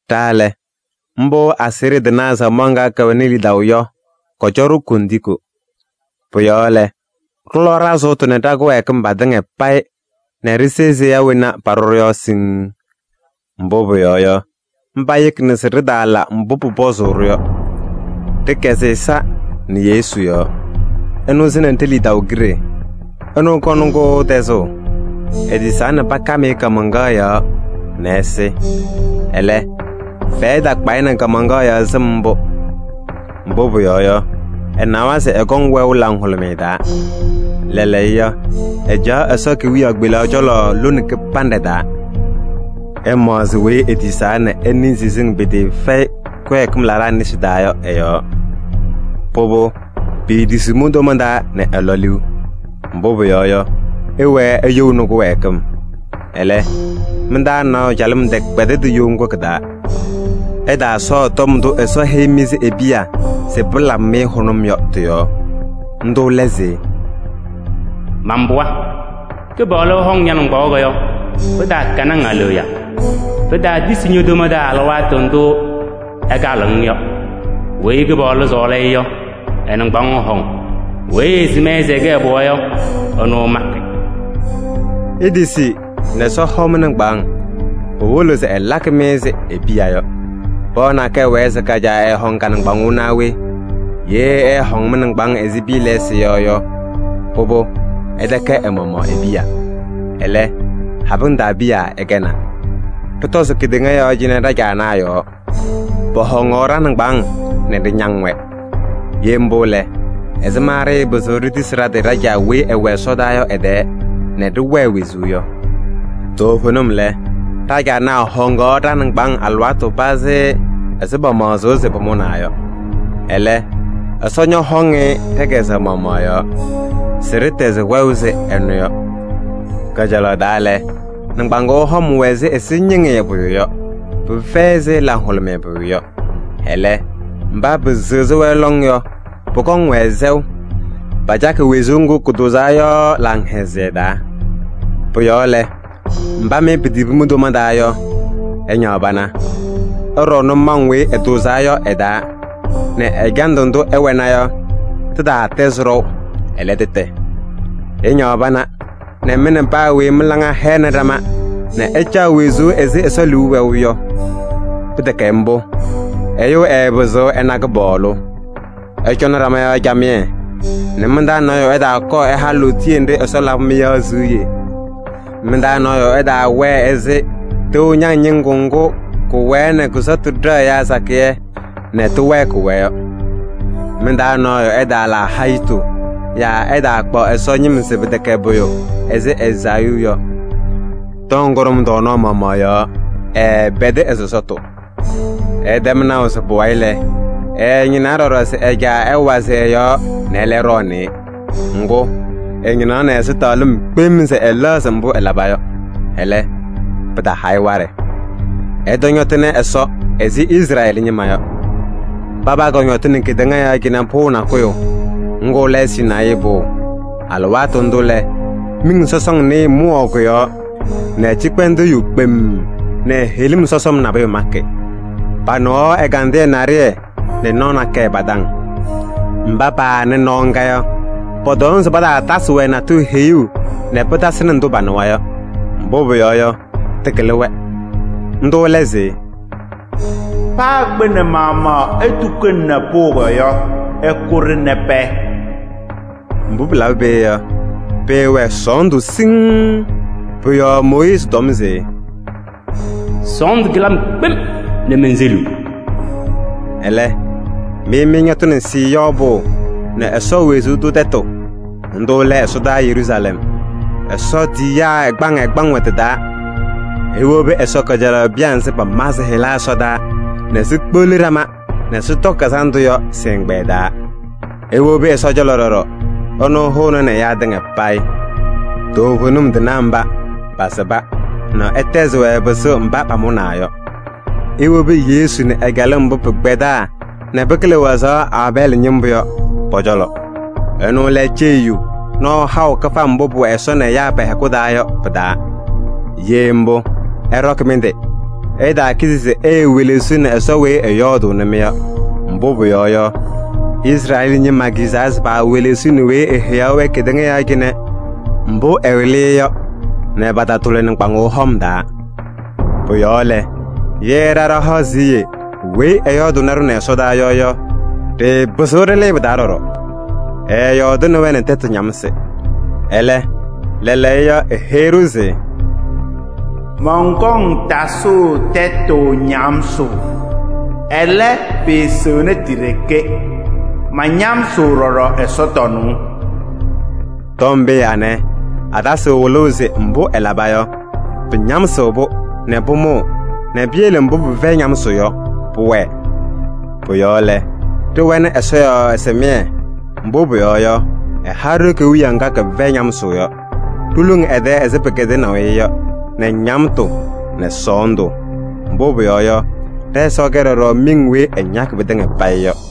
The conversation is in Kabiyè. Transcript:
Ɖa lɛ, mbʋ aseɣɖe tɩnaa samaɣ ŋga kɛwɛnɩ lidaʋ yɔ, kɔcɔ-ɖʋ kondiko. Pʋ-yɔɔ lɛ, ɖɩlɔ ɖa-sʋʋtʋ nɛ ɖa-kɩwɛɛkɩm patɩŋa payɩ nɛ ɖɩpɩzɩ ɖise seya wena paɖʋ-ɖʋ yɔ siŋŋ. Mbʋ pʋyɔɔ yɔ, mba yekina se ɖɩtaala mbʋ pʋpɔzʋʋ-ɖʋ yɔ. Ɖɩkɛzɩ ɛza nɛ Yesu yɔɔ: ɛnʋ sɩnɩ ɖe-lidaʋ kiɖe, ɛnʋ kɔŋnɩ-kʋ tɛzʋʋ. Etisaa nɛ pakam-ɩ kaamaŋkaɣ yɔɔ nɛ ɛsɩ. Ɛlɛ, fɛyɛ takpa-ɩ nɛ kaamaŋkaɣ yɔɔ sɩm mbʋ, mbʋ pʋyɔɔ yɔ, ɛnawa se ɛkɔŋ wɛʋ laŋhʋlʋmɩyɛ taa. Lɛɛlɛɛyɔ, ɛcaɣ Ɛsɔ kewiyaɣ kpelaɣ cɔlɔ lone kɩbanɖɛ taa. Ɩmaɣzɩ weyi etisaa nɛ ɛnɩɩ siziŋ pɩtɩɩfɛyɩ kɩwɛɛkɩm laɖaa nesi taa yɔ ɛ-yɔɔ. Pʋbʋ, piitisiɣ mi-toma taa nɛ ɩlɔ liu. Mbʋ pʋyɔɔ yɔ, ɩwɛɛ iyouni kɩwɛɛkɩm. Ɛlɛ, mɩ-taa nɔɔyʋ calɩm tɛkpɛdɩdɩ you ŋgʋ kɩ-taa. Ɩtaasɔɔ tɔm ndʋ Ɛsɔ heyi-mɩ ɛzɩ e-piya se pɩlabɩ-mɩ hʋnʋm yɔ tɩ-yɔɔ. Ndʋ lɛ se: “Man-pɩɣa, Kɩpaɣlʋ ɛhɔŋ ña-nɩŋgbaŋʋʋ yɔ, pɩtaakɛnɩ-ŋ aleɣya. Pɩtaatisi ño-toma taa alɩwaatʋ ndʋ ɛkalɩɣ-ŋ yɔ. Weyi Kɩpaɣlʋ sɔɔlɩ-ɩ yɔ, ɛ-nɩŋgbaŋʋʋ ɛhɔŋ, weyi ɛsɩm-ɩ se ɛkɛ ɛ-pɩɣa yɔ, ɛnʋ ɛmakɩ.” Itisi nɛ Ɛsɔ hɔ mɩ-nɩŋgbaaŋ: pɩwɩlɩɣ se ɛlakɩ-mɩ ɛzɩ e-piya yɔ. Pɩɣa nakɛyɛ wɛɛ se ka-caa ɛɛhɔŋ ka-nɩŋgbaŋʋʋ naa we? Ye ɛɛhɔŋ mɩ-nɩŋgbaaŋ ɛzɩ piya lɛɛsɩ yɔ yɔ, pʋbʋ, ɩtɛkɛ ɛ-maɣmaɣ e-piya. Ɛlɛ, habɩŋ taa piya ɩkɛnaa. Ɖɩtɔzɩ kedeŋa yɔɔ cɩnɛ ɖa-caanaa yɔɔ: pɔhɔŋaɣ ɖa-nɩŋgbaaŋ nɛ ɖɩñaŋ-wɛ. Ye mbʋ lɛ, ɛzɩma ɖɩɩpɩzɩɣ ɖitisi ɖa-tɩ ɖa-Caa weyi ɛwɛ ɛsɔdaa yɔ ɛ-tɛɛ nɛ ɖɩwɛɛ wezuu yɔ? Toovenim lɛ, ɖa-caanaa hɔŋaɣ ɖa-nɩŋgbaaŋ alɩwaatʋ pazɩ ɛzɩ pamaɣzʋʋ se pʋmʋnaa yɔ. Ɛlɛ, Ɛsɔ ñɔhɔŋ-ɩ ɖɛ-kɛzɛɣ maɣmaɣ yɔɔ se ɖɩtɛzɩ wɛʋ ɛzɩ ɛnʋ yɔ. Kajalaɣ taa lɛ, nɩŋgbaŋʋʋ hɔm wɛ ɛzɩ ɛzɩñɩŋɩyɛ pʋyʋ yɔ, pɩfɛyɩ ɛzɩ laŋhʋlʋmɩyɛ pʋyʋ yɔ. Ɛlɛ, mba pɩsɩɣzɩ-wɛ lɔŋ yɔ, pʋkɔŋ-wɛ sɛʋ: pacakɩ wezuu ŋgʋ kʋtʋʋzaa yɔ laŋhɛzɩyɛ taa. Pʋ-yɔɔ lɛ, mba mɩ pitibi mi-toma taa yɔ, ɩñaɣ pana. Ɩɖɔ nʋmɔŋ weyi ɩtʋʋzaa yɔ ɩ-taa nɛ ɛjandʋ ndʋ ɩwɛna yɔ tɩtaatɛzɩ ɖɔʋ, ɛlɛ, tɩtɛ. Ɩñaɣ pana nɛ mɩ nɛ paa weyi mɩ-laŋa hɛnɩ ɖama nɛ ɩcaɣ wezuu ɛzɩ Ɛsɔ liu wɛʋ yɔ. Pɩtɛkɛ mbʋ, ɛyʋ ɛɛpɩzɩɣ ɛna Kɩpaɣlʋ. Ɩcɔnɩ ɖama yɔɔ camɩyɛ nɛ mɩ-taa nɔɔyʋ ɛtaakɔɔ ɛha lootiye nɖɩ Ɛsɔ labɩ-mɩ yɔ siɣye. Mɩ-taa nɔɔyʋ ɛtaawɛɛ ɛzɩ tɩʋ ñaŋ ñɩŋgʋ ŋgʋ kɩwɛɛ nɛ kʋ-sɔtʋ ɖɛɣ ɛyaa sakɩyɛ nɛ tɩwɛɛkɩɣ-wɛ yɔ. Mɩ-taa nɔɔyʋ ɛtaala hayitu yaa ɛtaakpaɣ Ɛsɔ ñɩm se pɩtɛkɛ pʋyʋ ɛzɩ Ezaayuu yɔ. Tɔm kʋɖʋm tɔɔnaɣ maɣmaɣ yɔɔ ɛɛpɛdɩ ɛ-sɔsɔtʋ. Ɩtɛm naʋ se pʋwayɩ lɛ, ɛɛñɩnaa ɖɔɖɔ se ɛ-caa ɛwazɩ ɛ-yɔɔ nɛ ɛlɛ ɖɔɔnɩ-ɩ. Ŋgʋ, ɛñɩnaɣnɩ ɛzɩtɛɣlɩm kpem se ɛlɛɣzɩ mbʋ ɛlaba yɔ. Ɛlɛ, pɩtaha-ɩ waɖɛ. Ɩtɔñɔtɩnɩ Ɛsɔ ɛzɩ Izrɛɛlɩ ñɩma yɔ. Paba kɔñɔtɩnɩ kedeŋa yɔɔ cɩnɛ pʋʋ nakʋyʋ: ŋgʋ lɛ Sinayii Pʋʋ. Alɩwaatʋ ndʋ lɛ, miŋ sɔsɔŋ nɩɩyɩ mʋwaɣ kʋ-yɔɔ nɛ cɩkpɛndʋʋ yu kpemm nɛ heɣlim sɔsɔm nabʋyʋ makɩ. Panɩɣaɣ ɛgandɩyɛ naɖɩyɛ nɛ nɔɔ nakɛyɛ pa-taŋ. Mba paanɩ nɔɔ ŋga yɔ, pɔtɔm se pataatasɩ-wɛ natʋyʋ heyuu nɛ pɩtasɩnɩ ndʋ panɩwa yɔ, mbʋ pʋyɔɔ yɔ, tɩkɩlɩ-wɛ. Ndʋ lɛ se: “Paa kpɩnɛ maɣmaɣ etukunini pʋʋ yɔ, ɩkʋ-ɖɩ nɛ pɛɛ.” Mbʋ pɩlabɩ peeye yɔ, pɩɩwɛ sɔɔndʋ siŋŋ. Pʋ-yɔɔ Mooyiizi tɔm se: “Sɔɔndʋ kɩlɩ-m kpem nɛ menseliɣ.” Ɛlɛ, mɩ mɩñɔtɩnɩ Siiyɔɔ Pʋʋ nɛ Ɛsɔ wezuu tʋ tɛtʋ: ndʋ lɛ ɛsɔdaa Yeruusalɛm, Ɛsɔ tiyiyaa ɛgbaŋ ɛgbaŋ wɛ tɩ-taa. Iwobi Ɛsɔ kajalaɣ piya nzɩ pama sɩ-hɩla ɛsɔdaa nɛ sikpeɣli ɖama nɛ sɩtɔkɩ kazanɖʋ yɔ sɩ-ɛgbɛyɛ taa. Iwobi Ɛsɔ cɔlɔ ɖɔɖɔ, ɛnʋ hʋʋnɩnɩ ɛyaa tɩŋa payɩ: toovenim tɩnaa mba pasɩba nɛ ɛtɛzɩ-wɛ pɩsʋʋ mba pamʋnaa yɔ. Iwobi Yesu nɛ ɛ-calɩm mbʋ pɩkpɛdaa nɛ pɩkɩlɩ wazaɣ Aabɛɛlɩ ñɩmbʋ yɔ pɔ-cɔlɔ. Ɛnʋ lɛ ceyiyu nɔɔ haʋ kɩfam mbʋ pʋwɛ Ɛsɔ nɛ ɛyaa pɛ-hɛkʋ taa yɔ pɩ-taa. Ye mbʋ, ɩɖɔkɩ mɩ-tɩ! Ɩtaakizi se iiwelesiɣni Ɛsɔ weyi ɛyɔɔdʋʋnɩ-mɩ yɔ. Mbʋ pʋyɔɔ yɔ, Izrɛɛlɩ ñɩma kizaa se paawelesiɣni weyi eheyaɣ-wɛ kedeŋa yɔɔ cɩnɛ mbʋ ɛwɩlɩ-ɩ yɔ nɛ patatʋlɩ nɩŋgbaŋʋʋ hɔm taa. Pʋ-yɔɔ lɛ, ye ɖa ɖahaɣ siɣye weyi ɛyɔɔdʋʋnɩ-ɖʋ nɛ ɛsɔdaa yɔ yɔ, ɖɩɩpɩzɩɣ ɖɩlɩɩ pɩ-taa ɖɔɖɔ. Ɛɛyɔɔdɩnɩ-wɛ nɛ tɛtʋ ñamsɩ, ɛlɛ, lɛɛlɛɛyɔ eheyi-ɖʋ se: “Mɔnkɔŋ tasʋʋ tɛtʋ ñamsʋʋ. Ɛlɛ, pɩɩsɩɣnɩ ti-ɖeke, mañamsɩɣ ɖɔɖɔ ɛsɔtɔnʋʋ.” Tɔm pee anɛ, atasɩɣ wɩlʋʋ se mbʋ ɛlaba yɔ, pɩñamsɩɣ-pʋ nɛ pʋmʋʋ nɛ piyele mbʋ pɩfɛyɩ ñamsʋʋ yɔ pʋwɛɛ. Pʋ-yɔɔ lɛ, ɖɩwɛnɩ Ɛsɔ yɔɔ ɛsɩmɩyɛ, mbʋ pʋyɔɔ yɔ, ɛha-ɖʋ kewiyaɣ ŋga kɛfɛyɩ ñamsʋʋ yɔ: ɖiluŋ ɛ-tɛɛ ɛzɩ pɩkɛdɩnaʋ-ɩ yɔ nɛ ñamtʋ nɛ sɔɔndʋ. Mbʋ pʋyɔɔ yɔ, ɖɛ-Ɛsɔ kɛ ɖɔɖɔ miŋ weyi ɛñakɩ pɩtɩŋa payɩ yɔ.